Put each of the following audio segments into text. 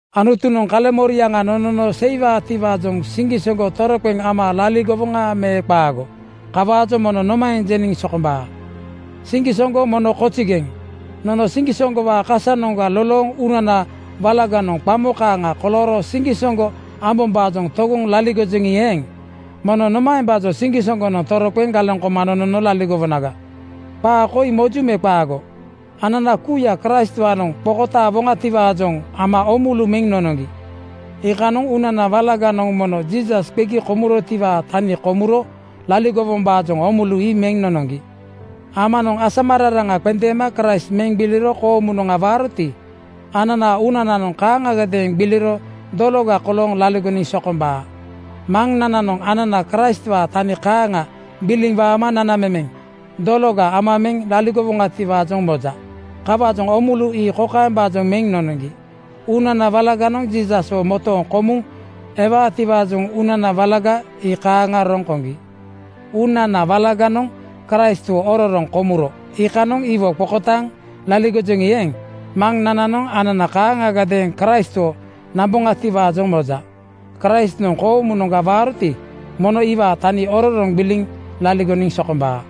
Anutunoŋ kaleŋmoriaŋa nonono seiwaatiwaajoŋ siŋgisoŋgo toroqeŋ ama laligowoŋa me qaago? Kawaajoŋ mono nomaeŋ jeniŋ sokombaa? Siŋgisoŋgo mono kozigeŋ! Nono siŋgisoŋgowaa kasanoŋga lolooŋ uunana walaganoŋ qamo kaaŋa kolooro siŋgisoŋgo ambombaajoŋ togoŋ laligojoŋi eeŋ, mono nomaembaajoŋ siŋgisoŋgonoŋ toroqeŋ galeŋ koma nonono laligowonaga? Qaa koi moju me qaago: Anana kuuya Kraistwaanoŋ qokotaawoŋatiwaajoŋ ama oomulu meŋ nonoŋgi. Iikanoŋ uunana walaganoŋ mono Jiisas qegi komurotiwaa tani komuro laligowombaajoŋ oomulu ii meŋ nonoŋgi. Amanoŋ asamararaŋa qendeema Kraist meŋ gbiliro koomunoŋga waaroti, ananaa uunananoŋ kaaŋagadeeŋ gbiliro dologa kolooŋ laligoniŋ sokombaa. Maŋnananoŋ anana Kraistwaa tani kaaŋa gbiliŋ waama nanamemeŋ dologa ama meŋ laligowoŋatiwaajoŋ moja. Kawaajoŋ oomulu ii kokaembaajoŋ meŋ nonoŋgi: Uunana walaganoŋ Jiisaswo motooŋ komuŋ ewaatiwaajoŋ uunana walaga ii kaaŋa roŋ koŋgi. Uunana walaganoŋ Kraistwo ororoŋ komuro iikanoŋ iwo qokotaaŋ laligojoŋi eeŋ, Maŋnananoŋ anana kaaŋagadeeŋ Kraistwo namboŋatiwaajoŋ moja. Kraistnoŋ koomunoŋga waaroti, mono iwaa tani ororoŋ gbiliŋ laligoniŋ sokombaa.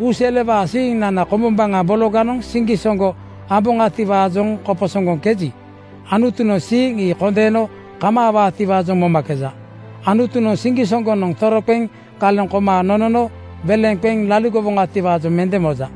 Uuselewaa siiŋnana kombombaŋa bologanoŋ siŋgisoŋgo amboŋatiwaajoŋ koposoŋgoŋkeji, Anutunoŋ siiŋ ii kondeeno kemebaatiwaajoŋ momakeja. Anutunoŋ siŋgisoŋgonoŋ toroqeŋ galeŋ koma nonono weleŋa qeŋ laligowoŋatiwaajoŋ mende moja.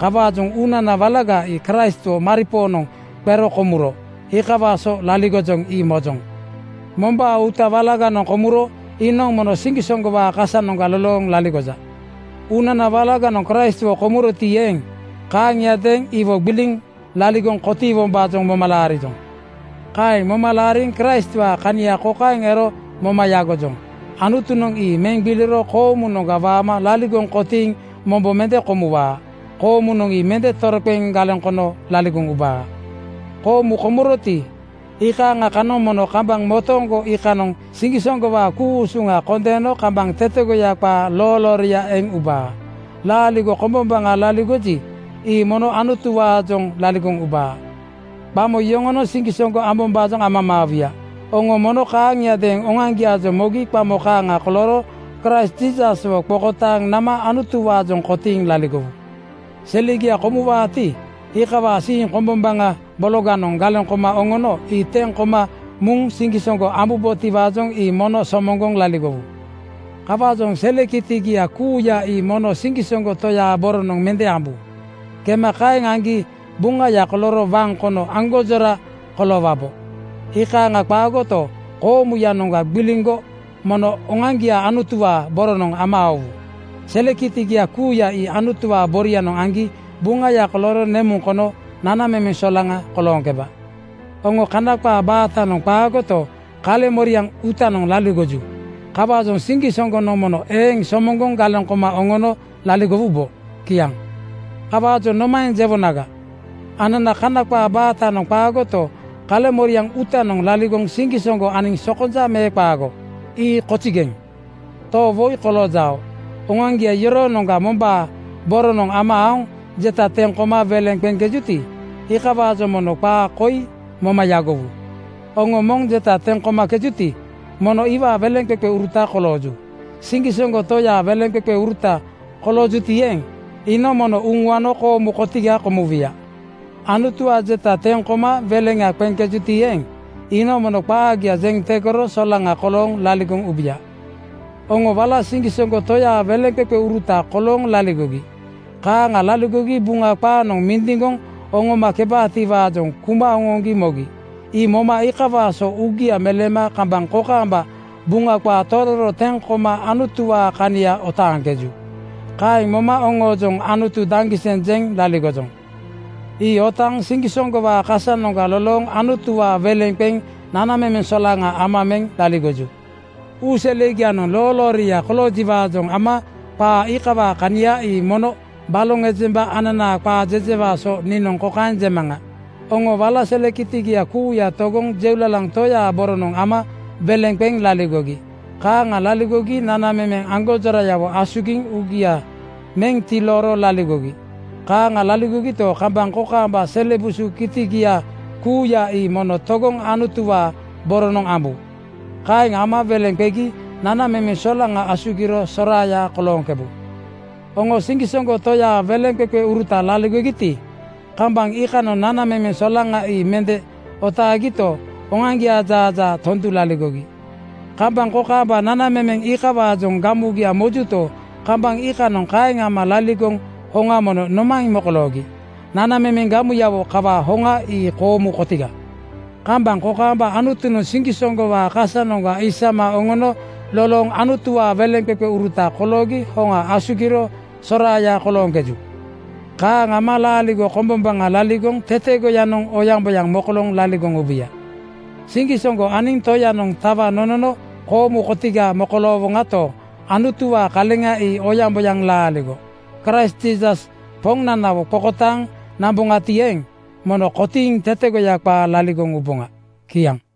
Kawaajoŋ uunana walaga ii Kraistwo maripoonoŋ qero komuro. Iikawaa so laligojoŋ, ii mojoŋ. Mombaa uuta walaganoŋ komuro iinoŋ mono siŋgisoŋgowaa kasanoŋga lolooŋ laligoja. Uunana walaganoŋ Kraistwo komuroti eeŋ, kaaŋiadeeŋ iwo gbiliŋ laligoŋ kotiiwombaajoŋ moma laarijoŋ. Kaeŋ moma laariŋ Kraistwaa kania kokaeŋ ero moma yagojoŋ: Anutunoŋ ii meŋ gbiliro koomunoŋga waama laligoŋ kotiiŋ mombo mende komuwaa. Koomunoŋ ii mende toroqeŋ galeŋ kono laligoŋ ubaa. Koomu komuroti, iikaaŋa kanoŋ mono kambaŋ motooŋgo iikanoŋ siŋgisoŋgowaa ku-usuŋa kondeeno kambaŋ tetegoya qaa loolooria eŋ ubaa. Laaligo kombombaŋa laligoji, ii mono Anutuwaajoŋ laligoŋ ubaa. Qamo yoŋonoŋ siŋgisoŋgo ambombaajoŋ amamaawuya. Oŋo mono kaaŋiadeeŋ oŋoaŋgiaajoŋ mogi qamo kaaŋa kolooro Kraist Jiisaswo qokotaaŋ nama Anutuwaajoŋ kotiiŋ laligowu. Selegia komuwaati, iikawaa siiŋ kombombaŋa bologanoŋ galeŋ koma oŋono ii teŋ koma muŋ siŋgisoŋgo ambubotiwaajoŋ ii mono somoŋgoŋ laligowu. Kawaajoŋ sele kitigia kuuya ii mono siŋgisoŋgo Toyaa boronoŋ mende ambu. Kema kaeŋ aŋgi buŋaya kolooro waŋ kono aŋgonjora koloowabo. Iikaaŋa qaagoto, koomuyanoŋga gbiliŋgo mono oŋoaŋgia Anutuwaa boronoŋ ama aowu. Sele kitigia kuuya ii Anutuwaa borianoŋ aŋgi buŋaya kolooro nemuŋ kono nanamemeŋ solaŋa kolooŋkebaa. Oŋo Kana qaa baatanoŋ qaagoto, kaleŋmoriaŋ uutanoŋ laligoju. Kawaajoŋ siŋgisoŋgonoŋ mono eeŋ somoŋgoŋ galeŋ koma oŋono laligowubo. Kiaŋ. Kawaajoŋ nomaeŋ jewonaga? Anana Kana qaa baatanoŋ qaagoto, kaleŋmoriaŋ uutanoŋ laligoŋ siŋgisoŋgo aniŋ sokonja me qaago? Ii kozigeŋ! To woi koloojao. Oŋoaŋgia yoroonoŋga mombaa boronoŋ ama aoŋ jeta teŋ koma weleŋa qeŋkejuti, iikawaajoŋ mono qaa koi moma yagowu: Oŋo moŋ jeta teŋ komakejuti, mono iwaa weleŋqeqeuruta kolooju. Siŋgisoŋgo Toyaa weleŋqeqeuruta koloojuti eeŋ, iinoŋ mono uŋuano koomu kotiga komuwuya. Anutuwaa jeta teŋ koma weleŋa qeŋkejuti eeŋ, iinoŋ mono qaagia jeŋ tegoro solaŋa kolooŋ laligoŋ ubuya. Oŋo wala siŋgisoŋgo Toyaa weleŋqeqeuruta kolooŋ laligogi. Kaaŋa laligogi Buŋa qaanoŋ mindiŋgoŋ oŋomakebaatiwaajoŋ kuma oŋoŋgi mogi. Ii moma iikawaa so uugia meleema kambaŋ kokaamba Buŋa qaa tororo teŋ koma Anutuwaa kania otaaŋkeju. Kaeŋ moma oŋoojoŋ “Anutu daŋgiseŋ!” jeŋ laligojoŋ. Ii otaaŋ siŋgisoŋgowaa kasanoŋga lolooŋ Anutuwaa weleŋ qeŋ nanamemeŋ solaŋa ama meŋ laligoju. Uuselegianoŋ loolooria koloojiwaajoŋ ama qaa iikawaa kania ii mono baloŋ ejemba ananaa qaa jejewaa so niinoŋ kokaeŋ jemaŋa: Oŋo wala sele kitigia kuuya togoŋ jeulalaŋ Toyaa (Satambaa) boronoŋ ama weleŋ qeŋ laligogi. Kaaŋa laligogi nanamemeŋ aŋgonjorayawo asugiŋ uugia meŋ tilooro laligogi. Kaaŋa laligogito, kambaŋ kokaamba sele busu kitigia kuuya ii mono togoŋ Anutuwaa boronoŋ ambu. Kaeŋ ama weleŋ qegi nanamemeŋ solaŋa asugiro soraaya kolooŋkebu. Oŋo siŋgisoŋgo Toyaa weleŋqeqeuruta laligogiti, kambaŋ iikanoŋ nanamemeŋ solaŋa ii mende otaagito, oŋoaŋgiaa jaajaa tondu laligogi. Kambaŋ kokaamba nanamemeŋ iikawaajoŋ gamugia mojuto, kambaŋ iikanoŋ iikaeŋ ama laligoŋ hoŋa mono nomaeŋ mokoloogi? Nanamemeŋ gamuyawo kawaa hoŋa ii koomu kotiga. Kambaŋ kokaamba Anutunoŋ siŋgisoŋgowaa kasanoŋga isama oŋono lolooŋ Anutuwaa weleŋqeqeuruta koloogi hoŋa asugiro soraaya kolooŋkeju. Kaaŋ ama laaligo kombombaŋa laligoŋ tetegoyanoŋ oyaŋboyaŋ mokolooŋ laligoŋ ubuya. Siŋgisoŋgo aniŋ Toyanoŋ tawa nonono koomu kotiga mokoloowoŋato, Anutuwaa kaleŋa ii oyaŋboyaŋ laaligo. Kraist Jiisas Poŋnanawo qokotaaŋ namboŋati eeŋ, mono kotiiŋ tetegoya qaa laligoŋ uboŋa. Kiaŋ.